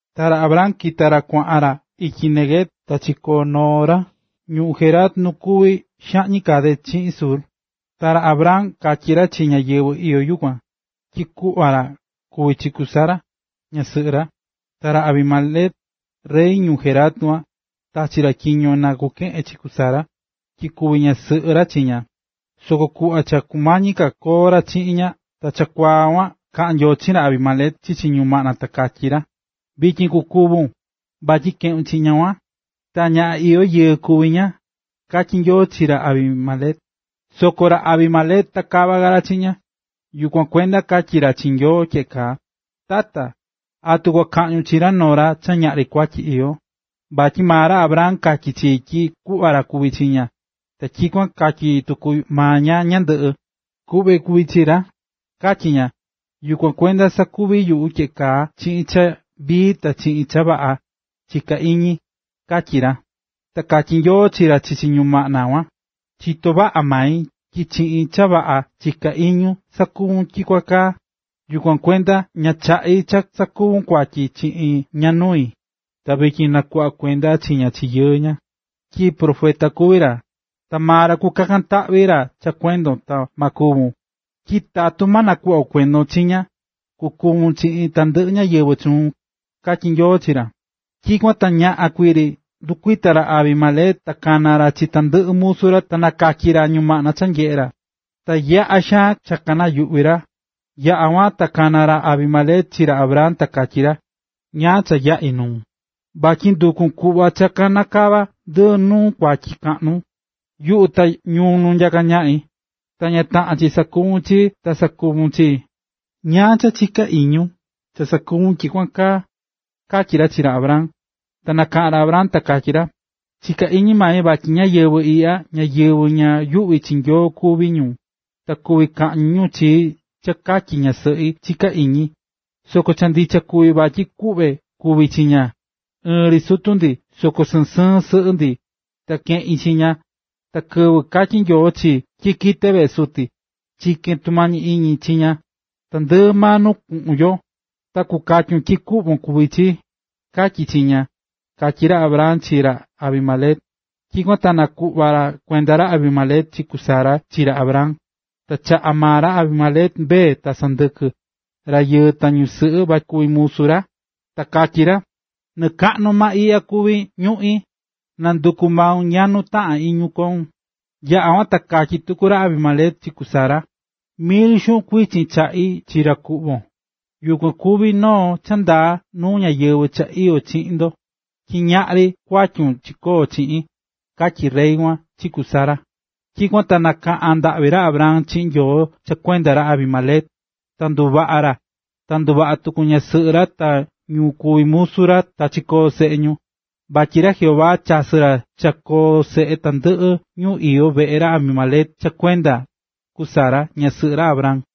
Ta ra Abraham kita̱ ra kuaꞌan ra ityi Neguev ta chikoo̱ noo ra ñuu Gerar nu kuví xaꞌñi Cades chiꞌin Shur. Ta ra Abraham katyi̱ ra chi ñáyɨvɨ iyó yukuan, tyi kuꞌva ra kuví chi ku Sara, ñasɨꞌɨ ra. Ta ra Abimelec, rey ñuu Gerar kuan, tachi̱ ra tyiño na kukeꞌen chi ku Sara, tyi kuvi ñasɨꞌɨ ra chi ña. Soko kuꞌva cha kumañi ka koo ra chiꞌin ña ta chakuaa kuan kaꞌa̱n Nyoo chiꞌin ra Abimelec chichi ñumaꞌna ta katyí ra: “Vityin kukúvun, vatyi keꞌu̱n chi ñaꞌan kuan, ta ñaꞌan iyó yɨɨ kuví ña”, katyí Nyoo chi ra Abimelec. Soko ra Abimelec ta kava ka ra chiꞌin ña, yukuan kuenda katyí ra chi Nyoo tyeꞌe kaa: “Tata, ¿atu kua kaꞌñun chi noo ra cha ñaꞌri kuatyi iyó? Vatyi maa ra Abraham katyi̱ chii tyi kuꞌva ra kuví chi ña, ta tyikuan katyí tuku maa ña ñandɨꞌɨ: ‘Kuꞌve kuví chi ra’, katyí ña. Yukuan kuenda sakuvi̱ yuꞌu tyeꞌe kaa chiꞌin cha vii ta chiꞌin cha vaꞌa, chiká iñi”, katyí ra. Ta katyí Nyoo chi ra chichi ñumaꞌna kuan: “Chitó vaꞌa mai tyi chiꞌin cha vaꞌa chiká iñun sakuvu̱n tyikuan kaa. Yukuan kuenda ña chaꞌi̱ cha sakuvun kuatyi chiꞌin ña nui. Vityin na̱kuꞌva kuenda chi ña chi yɨɨ ña, tyi profeta kuví ra, ta maa ra kukakan taꞌvi ra cha kuendon ta ma kúvun, tyi tatu ma nakuꞌva kuendon chi ña, kukúvun chiꞌin tandɨꞌɨ ñáyɨvɨ chuun”, katyí Nyoo chi ra. Tyikuan ta ñaꞌan kuii ri ndɨkuita̱ ra Abimelec ta kana̱ ra chi tandɨꞌɨ musu ra ta nakatyi̱ ra ñumaꞌna cha nyeꞌe̱ ra. Ta yaꞌa̱ xaan cha kanayuꞌvi̱ ra. Yaꞌa̱ kuan, ta kana̱ ra Abimelec chi ra Abraham ta katyí ra: ―¿Ñáá cha yaꞌi̱ nuun?, vatyi nduku̱n kuꞌva cha kanakava ndi nu kuatyi kaꞌnu, yuꞌu ta ñuu nu nyaká ñaꞌi. Cha ña taꞌán chi sakuvún chii, ta sakuvu̱n chii. ¿Ñáá cha chiká iñun cha sakuvu̱n tyikuan kaa? ―katyí ra chi ra Abraham. Nakaꞌa̱n ra Abraham ta katyí ra: ―Chiká iñi mai vatyi ñáyɨvɨ iꞌya ñáyɨvɨ ña yuꞌví chi Nyoo kuví ñu, ta kuví kaꞌñi ñu chii cha katyi ñasɨꞌi, chiká iñi. Soko cha ndicha kuví vatyi kuꞌve kuví chi ña. Ɨɨn ri sutu ndi soko sɨɨn sɨɨn sɨꞌɨ ndi, ta keꞌi̱n chi ña. Ta kɨvɨ katyi̱ Nyoo chii tyi kite veꞌe suti, chike̱n tumañi iñi chi ña: “Tandɨꞌɨ maa nu kuꞌun yo, ta kukatyun tyi kuꞌvon kuví chii”, katyi̱ chi ña ―katyí ra Abraham chi ra Abimelec. Tyikuan ta nakuꞌva̱ kuenda ra Abimelec chi ku Sara chi ra Abraham. Ta chaꞌa̱ maa ra Abimelec mbee, ta sɨndɨkɨ, rayɨɨ ta ñusɨꞌɨ vatyi kuvi ñu musu ra. Ta katyí ra: ―Nɨɨ kaꞌnu maa iꞌya kuví ñuꞌín, na̱nduku maun nya nuu taꞌán iñun koun. Yaꞌa̱ kuan ta katyí tuku ra Abimelec chi ku Sara: ―Mil xuꞌun kuichin chaꞌi̱ chi ra kuꞌvon, yukuan kuvi noo cha ndaa nuu ñáyɨvɨ cha iyó chiꞌin ndo, tyi ñaꞌri kuatyun chikoo̱ chiꞌin ―katyí rey kuan chi ku Sara. Tyikuan ta kaꞌa̱n ndaꞌvi ra Abraham chiꞌin Nyoo cha kuenda ra Abimelec, ta nduvaꞌa̱ ra, ta nduvaꞌa̱ tuku ñasɨꞌɨ ra ta ñu kuví musu ra ta kachikoo̱ seꞌe ñu. Vatyi ra Jehová chasɨ̱ ra cha koo seꞌe tandɨꞌɨ ñu iyó veꞌe ra Abimelec cha kuenda ku Sara, ñasɨꞌɨ ra Abraham.